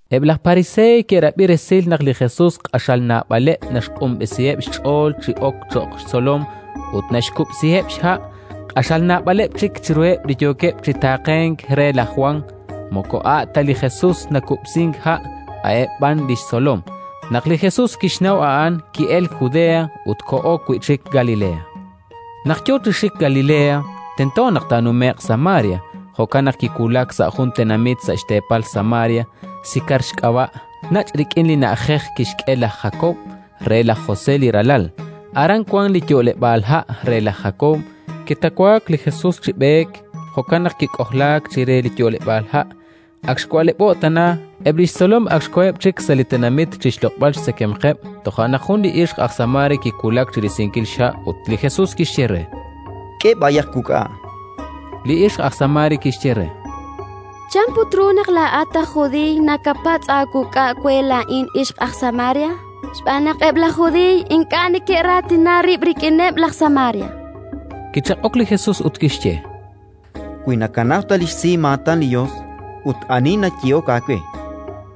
Eb' laj Pariseey ke'rab'i resil naq li Jesus q'axal naab'aleb' naxq'unb'esiheb' xch'ool chi ok cho'q xtzolom ut naxkub'siheb' xha', q'axal naab'aleb' chik chiruheb' li yookeb' chi taaqenk re laj Jwan (moko a' ta li Jesus nakub'sink ha', a'eb' b'an li xtzolom). Naq li Jesus kixnaw a'an, ki'elk Judea ut koho wi' chik Galilea. Naq yo chi xik Galilea, tento naq taanume'q Samaria. Jo'kan naq kiwulak sa' jun tenamit sa' xteepal Samaria, Sikar xk'ab'a', nach' rik'in li na'ajej kixk'e laj Jakob re laj José li ralal. Aran wank li yo'leb'aal ha' re laj Jakob. Kitawaak li Jesus chi b'eek, jo'kan naq kik'ojlaak chire li yo'leb'aal ha'. Ak xwa'leb'o'k tana. Eb' li xtzolom ak xkoheb' chik sa' li tenamit chi xloq'b'al xtzekemqeb'. Toja' naq jun li ixq aj Samaria kiwulak chi risinkil xha', ut li Jesus kixye re: —K'e b'ayaq wuk'a'. Li ixq aj Samaria kixye re: —Chan put ru naq laa'at aj judiiy nakapatz' aawuk'a' we laa'in ixq aj Samaria? Xb'aan naq eb' laj Judiiy ink'a' neke'raatina rib' rik'ineb' laj Samaria. Kichaq'ok li Jesus ut kixye: —Wi nakanaw ta li xsimaatan li Yos ut ani li nayehok aawe: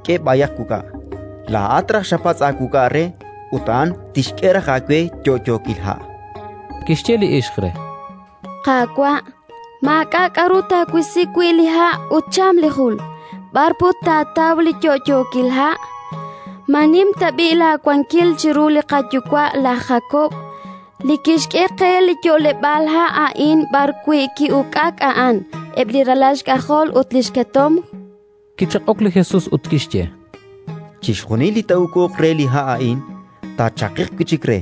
«K'e b'ayaq wuk'a'», laa'at raj xapatz' aawuk'a' re ut a'an tixk'e raj aawe yo'yookil ha'. Kixye li ixq re: —Qaawa', maak'a' k'aru taawisi wi' li ha' ut cham li jul: b'ar put taataw li yo'yookil ha'? Ma nim tab'i' laawankil chiru li qayuwa' laj Jakob, li kixk'e qe li yo'leb'aal ha' a'in b'arwi' ki'uk'ak a'an, eb' li ralal xk'ajol ut li xketomq? Kichaq'ok li Jesus ut kixye: —Chixjunil li taa'uk'uq re li ha' a'in, taachaqiq wi' chik re,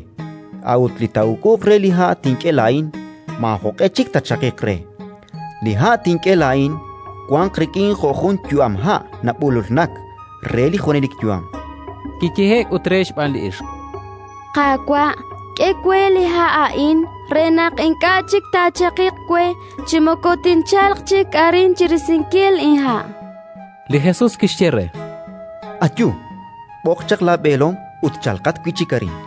a'ut li taa'uk'uq re li ha' tink'e laa'in, maajoq'e chik taachaqiq re: li ha' tink'e laa'in wanq rik'in jo' jun yu'amha' nab'ululnak re li junelik yu'am. Kiyehe'k ut re xb'aan li ixq: —Qaawa', k'e we li ha' a'in re naq ink'a' chik taachaqiq we chi moko tinchalq chik arin chi risinkil inha'. Li Jesus kixye re: —Ayu, b'oq chaq laab'eelom ut chalqat wi' chik arin.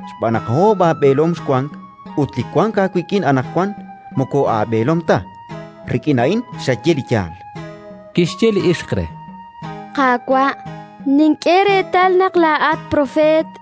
Xb'aan naq oob' aab'eelom xwank ut li wank aawik'in anaqwan moko aab'eelom ta; rik'in a'in xaye li yaal. Kixye li ixq re: —Qaawa', nink'e reetal naq laa'at propeet.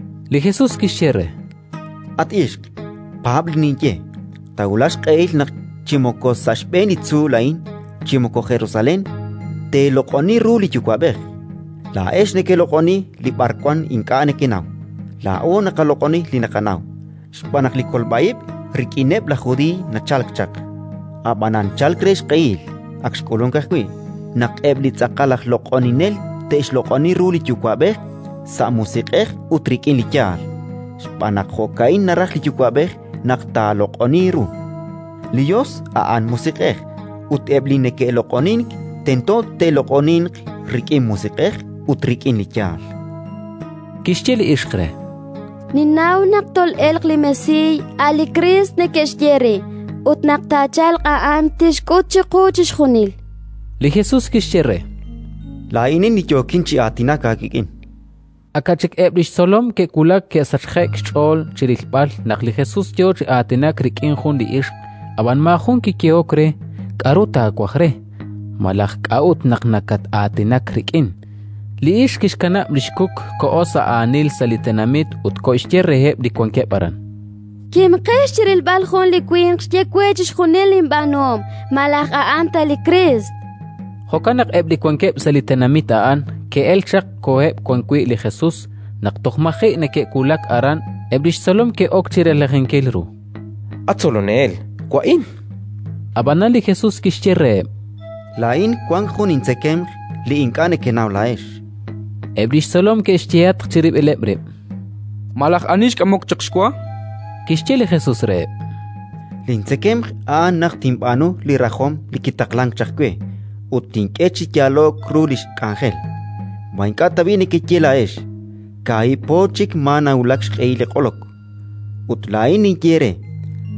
Li Jesus kixye re: —At ixq, paab' li ninye: Taawulaq xq'ehil naq chi moko sa' xb'een li tzuul a'in chi moko Jerusalén teeloq'oni ru li Yuwa'b'ej. Laa'ex nekeloq'oni li b'arwan ink'a' nekenaw; laa'o naqaloq'oni li naqanaw, xb'aan naq li kolb'a ib' rik'ineb' laj Judiiy nachalk chaq. Ab'anan chalk re xq'ehil (ak xk'ulunk ajwi') naq eb' li tz'aqal aj loq'oninel te'xloq'oni ru li Yuwa'b'ej sa' musiq'ej ut rik'in li yaal, xb'aan naq jo'ka'in naraj li Yuwa'b'ej naq taaloq'oniiq ru. Li Yos a'an musiq'ej, ut eb' li neke'loq'onink tento te'loq'oninq rik'in Musiq'ej ut rik'in li yaal. Kixye li ixq re: —Ninnaw naq tol'elq li Mesiiy, a' li Kriist neke'xye re; ut naq taachalq a'an, tixk'ut chiqu chixjunil. Li Jesus kixye re: —Laa'inin, li yookin chi aatinak aawik'in. Aka' chik eb' li xtzolom ke'wulak, ke'sachje'k xch'ool chi rilb'al naq li Jesus yo chi aatinak rik'in jun li ixq. Ab'an maajun kiyehok re: “K'aru taawaj re?”, malaj: “K'a'ut naq nakat-aatinak rik'in?”. Li ixq kixkanab' li xkuk, koho sa' aanil sa' li tenamit ut koxye reheb' li wankeb' aran: —Kimqex chi rilb'al jun li winq xye we chixjunil linb'aanuhom. Malaj a'an ta li Kriist? Jo'kan naq eb' li wankeb' sa' li tenamit a'an, ke'elk chaq ut koheb' wan wi' li Jesus. Naq toj maji' neke'wulak aran, eb' li xtzolom ke'ok chi relajinkil ru: —At Tzolonel, wa'in. Ab'anan li Jesus kixye reheb': —Laa'in wank jun intzekemq li ink'a' nekenaw laa'ex. Eb' li xtzolom ke'xyehatq chirib'ileb' rib': —Malaj ani xk'amok chaq xwa? Kixye li Jesus reheb': —Lintzekemq a'an naq tinb'aanu li rajom li kitaqlank chaq we ut tink'e chi yaalo'k ru li xk'anjel. Ma ink'a' tab'i' nekeye laa'ex: «Kaahib' po chik maa nawulak xq'ehil li q'olok»? Ut laa'in ninye eere: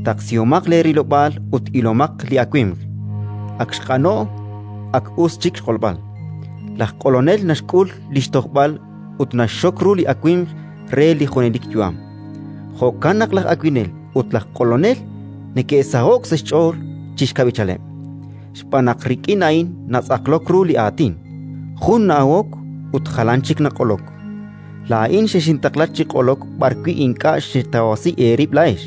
Taqsihomaq leerilob'aal ut ilomaq li awimq; ak xq'ano'k, ak us chik xq'olb'al. Laj q'olonel naxk'ul li xtojb'al ut naxxok ru li awimq re li junelik yu'am; jo'kan naq laj awinel ut laj q'olonel neke'saho'k sa' xch'ool chi xkab'ichaleb'. Xb'aan naq rik'in a'in natz'aqlok ru li aatin: «Jun na'awok ut jalan chik naq'olok». Laa'in xexintaqla chi q'olok b'arwi' ink'a' xetawasi eerib' laa'ex.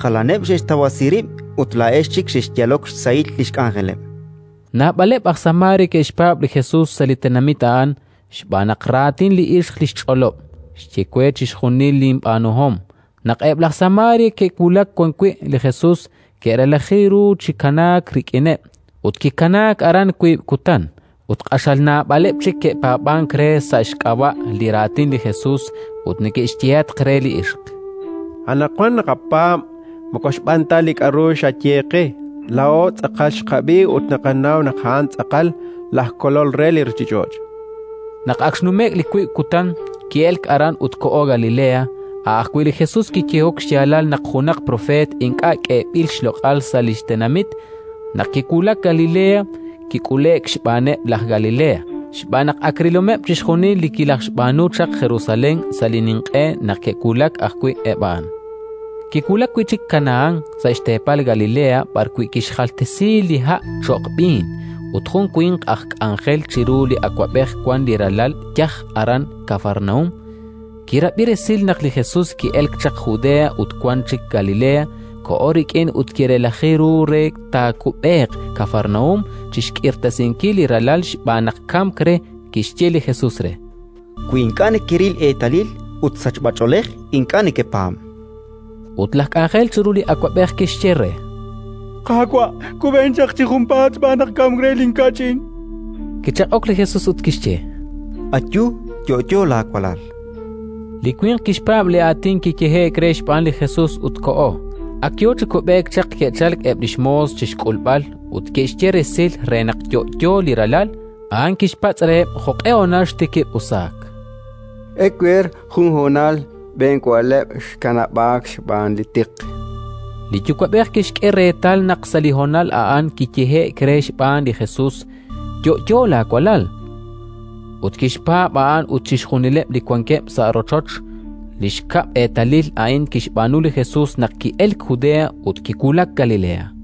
Jalaneb' xe'xtawasi rib' ut laa'ex chik xexyalok xsahil li xk'anjeleb'. Naab'aleb' aj Samaria ke'xpaab' li Jesus sa' li tenamit a'an, xb'aan raatin li ixq li xch'olob': “Xye we chixjunil linb'aanuhom”. Naq eb' laj Samaria ke'wulak wan wi' li Jesus, ke'relaji ru chi kanaak rik'ineb'. Ut kikanaak aran wiib' kutan. Ut q'axal naab'aleb' chik ke'paab'ank re sa' xk'ab'a' li raatin li Jesus, ut neke'xyehatq re li ixq: —Anaqwan naqapaab' moko xb'aan ta li k'aru xaye qe. Laa'o tz'aqal xqab'i ut naqanaw naq a'an tz'aqal laj Kolol re li ruuchich'och'. Naq ak xnume'k li wiib' kutan, ki'elk aran ut koho Galilea: a' ajwi' li Jesus kiyehok xyaalal naq junaq propeet ink'a' k'eeb'il xloq'al sa' li xtenamit. Naq kiwulak Galilea, kik'ule'k xb'aaneb' laj Galilea, xb'aan naq ak rilomeb' chixjunil li kilajxb'aanu chaq Jerusalén sa' li ninq'e naq ke'wulak ajwi' eb' a'an. Kiwulak wi' chik Kanahán, sa' xteepal Galilea b'arwi' kixjaltesi li ha' cho'q b'iin. Ut jun li winq aj k'anjel chiru li awab'ej wank li ralal yaj aran Kafarnaúm. Kirab'i resil naq li Jesus ki'elk chaq Judea ut wank chik Galilea, koho rik'in ut kirelaji ru re taakub'eeq Kafarnaúm chi xk'irtasinkil li ralal xb'aan naq kamk re. Kixye li Jesus re: —Wi ink'a' nekeril eetalil ut sachb'ach'oolej, ink'a' nekepaab'. Ut laj k'anjel chiru li awab'ej kixye re: —Qaawa', kub'en chi junpaat, xb'aan naq kamk re linkach'in. Kichaq'ok li Jesus ut kixye: —Ayu, yo'yo laawalal. Li winq kixpaab' li aatin kiyehe'k re xb'aan li Jesus ut koho. Ak yo chi kub'eek naq ke'chalk eb' li xmoos chi xk'ulb'al ut ke'xye resil re naq yo'yo li ralal! A'an kixpatz' reheb' jo'q'e honal xtikib' usaak. —Ewer, jun honal xb'een wa'leb' xkanab'aak xb'aan li tiq. Li yuwa'b'ej kixk'e reetal naq sa' li honal a'an kiyehe'k re xb'aan li Jesus: “Yo'yo laawalal”. Ut kixpaab' a'an ut chixjunileb' li wankeb' sa' rochoch. Li xkab' eetalil a'in kixb'aanu li Jesus naq ki'elk Judea ut kiwulak Galilea.